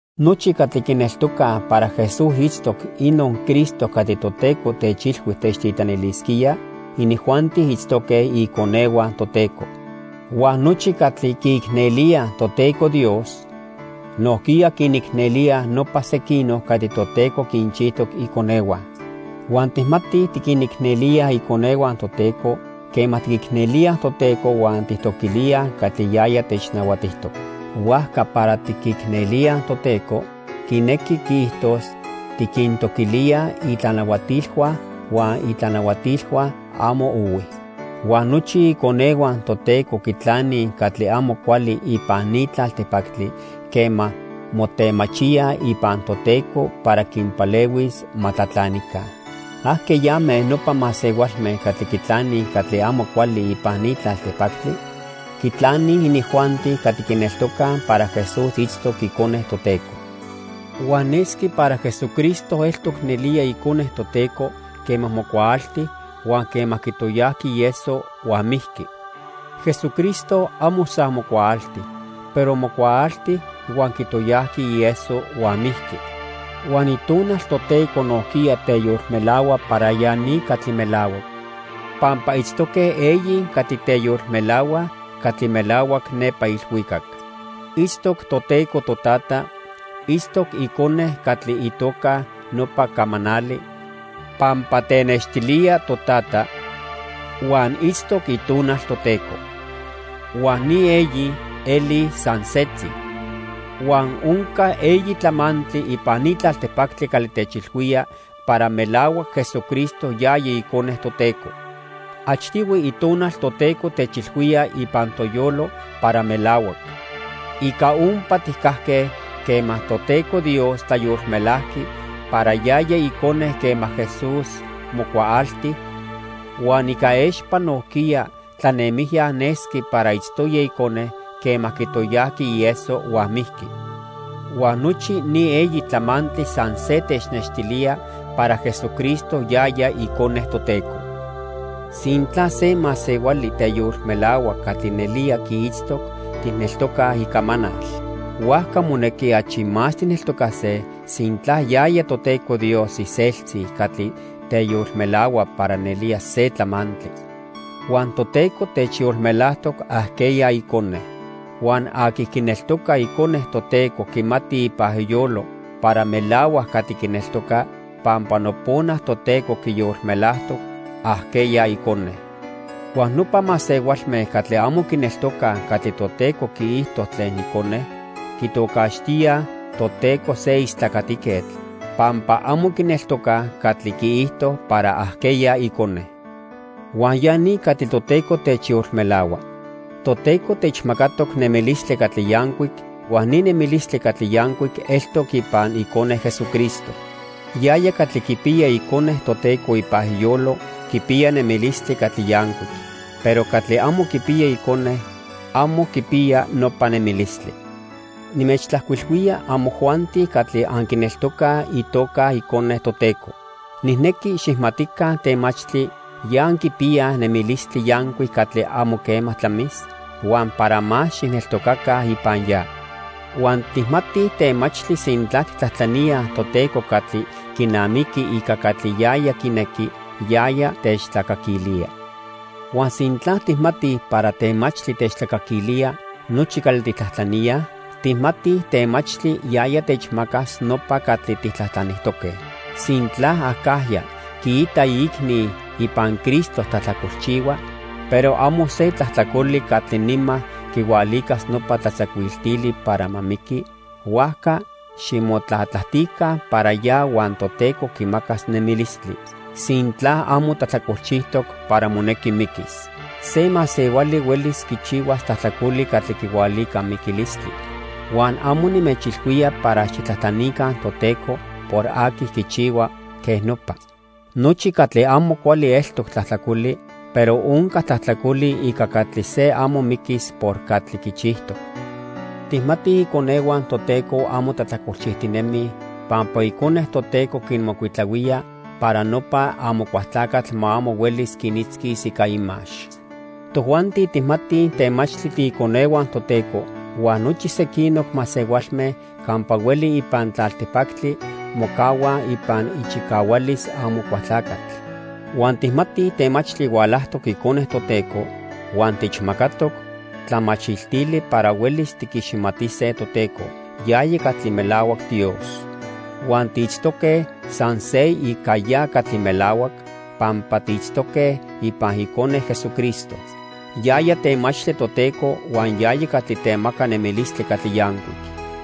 Nochi catli quineltocaj para Jesús itztoc inon Cristo catli Toteco techilhui techtitlanilisquía, inijuanti itztoque iconehua Toteco. Huan nochi catli quiicnelíaj Toteco Dios, nojquiya quinicnelíaj nopa sequinoc catli Toteco quinchijtoc iconehua. Huan tijmatij tiquinicnelíaj iconehua Toteco quema tiquicnelíaj Toteco huan tijtoquilíaj catli yaya technahuatijtoc. Huajca para tiquicnelíaj Toteco quinequi quiijtos tiquintoquilíaj itlanahuatilhua, huan itlanahuatilhua amo ohui. Huan nochi iconehua Toteco quitlanij catli amo cuali ipan ni tlaltipactli quema motemachíaj ipan Toteco para quinpalehuis ma tlatlanica. ¿Ajqueyame nopa masehualme catli quitlanij catli amo cuali ipan ni tlaltipactli? Quitlanij inijuanti catli quineltocaj para Jesús itztoc Icone Toteco. Huan nesqui para Jesucristo eltoc nelía Icone Toteco quema mocuaalti huan quema quitoyajqui ieso huan mijqui. Jesucristo amo san mocuaalti, pero mocuaalti, huan quitoyajqui ieso huan mijqui. Huan Itonal Toteco nojquiya teyolmelahua para ya ni catli melahuac. Pampa itztoque eyi catli teyolmelahuaj catli melahuac nepa ilhuicac. Itztoc Toteco Totata, itztoc Icone catli itoca nopa "camanali" pampa tenextilía Totata, huan itztoc Itonal Toteco. Huan ni eyi elij san setzi. Huan onca eyi tlamantli ipan ni tlaltipactli catli techilhuía para melahuac Jesucristo yaya icone Toteco. Achtihui Itonal Toteco techilhuía ipan toyolo para melahuac. Ica ompa tijcajque quema Toteco Dios tlayolmelajqui para yaya Icone quema Jesús mocuaalti, huan ica expa nojquiya tlanemijya nesqui para itztoya Icone quema quitoyajqui ieso huan mijqui. Huan nochi ni eyi tlamantli san se technextilía para Jesucristo yaya Icone Toteco. Sintla se masehuali teyolmelahua catli nelía quiitztoc, tijneltocaj icamanal. Huajca monequi achi más tijneltocase sintla yaya Toteco Dios iseltzi catli teyolmelahua para nelía se tlamantli. Huan Toteco techyolmelajtoc ajqueya Icone. Huan aqui quineltoca Icone Toteco quimati ipan iyolo para melahuac catli quineltoca pampa nopona Toteco quiyolmelajtoc ajqueya icone. Huan nopa masehualme catli amo quineltocaj catli Toteco quiijto tlen Icone, quitocaxtíaj Toteco se istlacatiquetl, pampa amo quineltocaj catli quiijto para ajqueya Icone. Huan ya ni catli Toteco techyolmelahua: Toteco techmacatoc nemilistli catli yancuic huan ni nemilistli catli yancuic eltoc ipan Icone Jesucristo. Yaya catli quipiya Icone Toteco ipan iyolo quipiya nemilistli catli yancuic, pero catli amo quipiya Icone, amo quipiya nopa nemilistli. Nimechtlajcuilhuía amojuanti catli anquineltocaj itoca Icone Toteco. Nijnequi xijmatica temachtli ya anquipiyaj nemilistli yancuic catli amo quema tlamis, huan para más xijneltocaca ipan ya. Huan tijmatij temachtli sintla tijtlajtlaníaj Toteco catli quinamiqui ica catli yaya quinequi, yaya techtlacaquilía. Huan sintla tijmatij para temachtli techtlacaquilía nochi catli tijtlajtlaníaj, tijmatij temachtli yaya techmacas nopa catli tijtlajtlanijtoque. Sintla acajya quiita iicni ipan Cristo tlajtlacolchihua, pero amo se tlajtlacoli catli nima quihualicas nopa tlatzacuiltili para ma miqui, huajca ximotlatlajtica para ya huan Toteco quimacas nemilistli, sintla amo tlajtlacolchijtoc para monequi miquis. Se masehuali huelis quichihua tlajtlacoli catli quihualica miquilistli, huan amo nimechilhuía para xijtlajtlanica Toteco por aqui quichihua quej nopa. Nochi catli amo cuali eltoc tlajtlacoli, pero onca tlajtlacoli ica catli se amo miquis por catli quichijtoc. Tijmatij iconehua Toteco amo tlajtlacolchijtinemij pampa Icone Toteco quinmocuitlahuía para nopa Amocualtlacatl ma amo huelis quinitzquis ica imax. Tojuanti tijmatij temachtli tiiconehua Toteco huan nochi sequinoc masehualme campa hueli ipan tlaltipactli mocahuaj ipan ichicahualis Amocualtlacatl. Huan tijmatij temachtli hualajtoc Icone Toteco huan techmacatoc tlamachiltili para huelis tiquiximatise Toteco yaya catli melahuac Dios. Huan tiitztoque san se ica ya catli melahuac, pampa tiitztoque ipan Icone, Jesucristo. Yaya temachtli Toteco huan yaya catli temaca nemilistli catli yancuic.